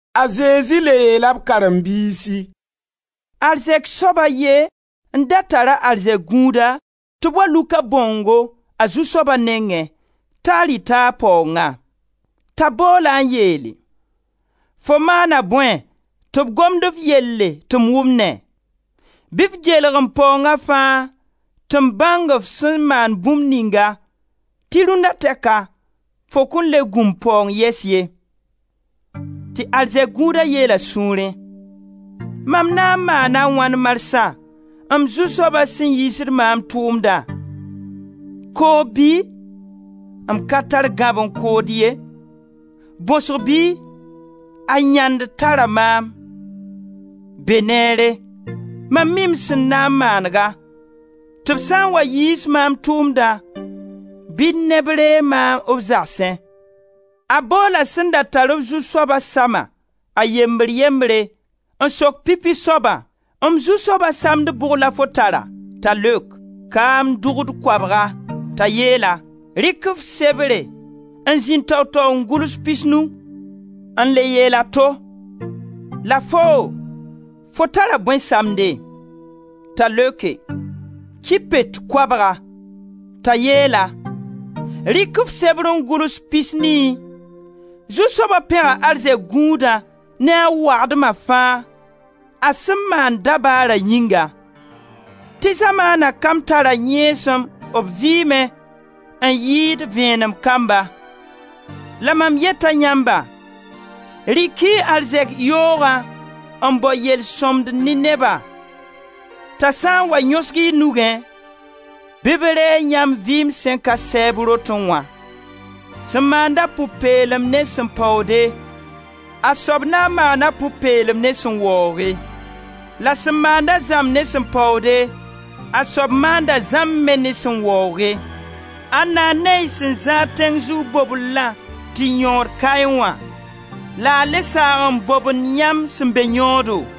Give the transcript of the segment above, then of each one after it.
A Zezi le yeela b karen-biisi: «Arzɛk soab a ye n da tar arzɛk gũuda tɩ b wa luk a bãongo a zu-soaba nengẽ t'a rɩta a paoongã. T'a bool-a n yeele: ‹Fo maana bõe tɩ b gomd f yelle tɩ m wʋmnẽ? Bɩ f geelg m paoonga fãa tɩ m bãng f sẽn maan bũmb ninga, tɩ rũnna tɛka fo kõn le gũ m paoong yɛs ye.› Tɩ arzɛk gũuda yeel a sũurẽ: ‹Mam na n maana a wãn marsã, m zu-soaba sẽn yiisd maam tʋʋmdã? Koob bɩ? M ka tar gãb n kood ye. Bõsg bɩ? A yãnd tara maam. Be neere, mam mi m sẽn na n manega, tɩ b sã n wa yiis maam tʋʋmdã bɩ neb reeg maam b zagsẽ.› A boola sẽn da tar-b zu-soaba sama, a yembr yembre, n sok pipi soabã: ‹M zu-soaba samd bʋg la fo tara?› T'a leok: ‹Kaam dʋgd koabga.› T'a yeel-a: ‹Rɩk f sebre n zĩnd tao-tao n gʋls pisnu.› N le yeel a to: ‹La foo, fo tara bõe samde?› T'a leoke: ‹Ki pet koabga.› T'a yeel-a: ‹Rɩk f sebre n gʋls pisnii.› Zu-soaba pẽga arzɛk gũudã ne a wagdma fãa, a sẽn maan dabaara yĩnga. Tɩ zamaana kamb tara yẽesem b vɩɩmẽ, n yɩɩd vẽenem kamba. La mam yeta yãmba: rɩk-y y arzɛk yoogã n bao yel-sõmd ne nebã t'a sã n wa yõsg y nugẽ bɩ b reeg yãmb vɩɩm sẽn ka sɛɛb rotẽ wã. Sẽn maand-a pʋ-peelem ne sẽn paoode, a soab na n maana pʋ-peelem ne sẽn waooge; la sẽn maanda zãmb ne sẽn paoode, a soab maanda zãmb me ne sẽn waooge. Ãnda n ne y sẽn zãad tẽng zug bobellã tɩ yõod kaẽ wã, la a le saag n bobend yãmb sẽn be yõodo?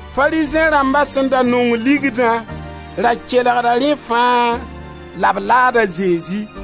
Farizẽ rãmba sẽn da nong ligdã ra kelgda rẽ fãa, la b laad a Zezi.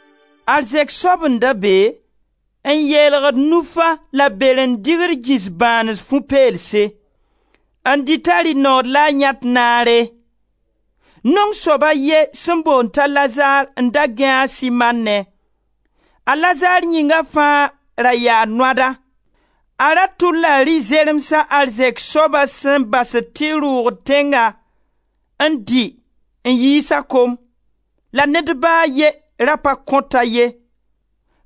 Arzɛk soab n da be n yeelgd nufa la beren-dɩgr gĩs bãanes fu peelse, n dɩt a rɩ nood la a yãet naare. Naong soab a ye sẽn boond t'a Lazar n da gãe a sɩmannẽ; a Lazar yĩnga fãa ra yaa noada. A ra tʋlla rɩ-zeremsa arzɛk soaba sẽn basd tɩ rʋʋgd tẽnga n dɩ n yiis a kom, la ned ba a ye ra pa kõt-a ye;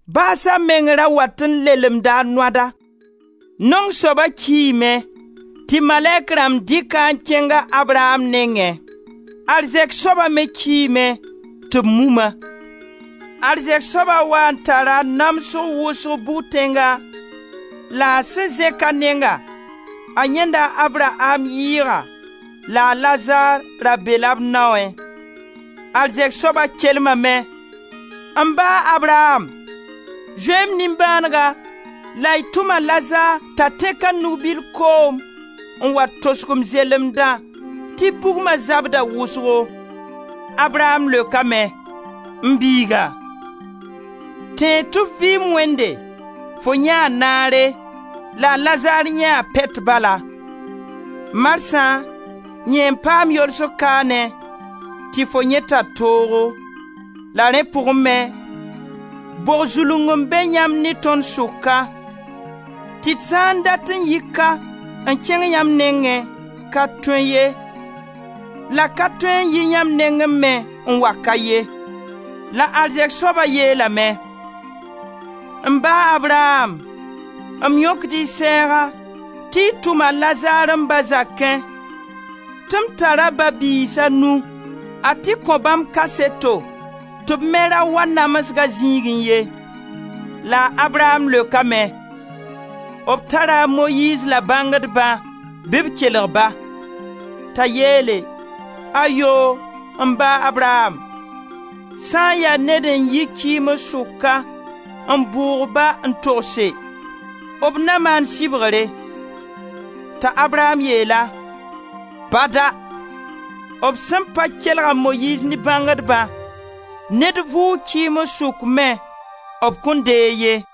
baasa meng ra wat n lelemda a noada. Naong soaba kiime tɩ malɛk rãmb dɩk-a n kẽng a Abraam nengẽ. Arzɛk soaba me kiime tɩ b mum-a. Arzɛk soaba waa n tara namsg wʋsg bʋg-tẽnga la a sẽn zẽk a nenga, a yãenda a Abraam yɩɩga la a Lazar ra be-la b naoẽ. Arzɛk soaba kelmame: ‹M ba, Abraam, zoe-y m nimbãanega la y tʋm a Lazar t'a tẽk a nug-bil koom n wa tosg m zelemdã tɩ bugma zabda wʋsgo.› A Abraam leokame: ‹M biiga, tẽeg tɩ f vɩɩm wẽnde, fo yãee naare la a Lazar yãee pɛt bala; marsã yẽ n paam yolsg kaane tɩ fo yẽ tar toogo. La rẽ pʋgẽ me, bog zulung n be yãmb ne tõnd sʋka, tɩ d sã n dat n yi ka n kẽng yãmb nengẽ, ka tõe ye, la ka tõe n yi yãmb nengẽ me n wa ka ye.› La arzɛk soaba yeelame: ‹M ba, Abraam, m yõkd-y sɛɛga tɩ y tʋm a Lazar m ba zakẽ tɩ m tara ba-b-biis a nu; a tɩ kõ bãmb kaseto tɩ b me ra wa namsga zĩigẽ ye.› La a Abraam leokame: ‹B tara a Moyiiz la bãngdba, bɩ b kelg-ba.› T'a yeele: ‹Ayoo! M ba, Abraam, sã n ya ned n yi kɩɩms sʋka n bʋʋg-ba n togse, b na maan sɩbgre.› T'a Abraam yeel-a: ‹Bada! B sẽn pa kelg a Moyiiz ne bãngdbã, ned vʋʋg kɩɩms sʋk me b kõn deeg ye.›»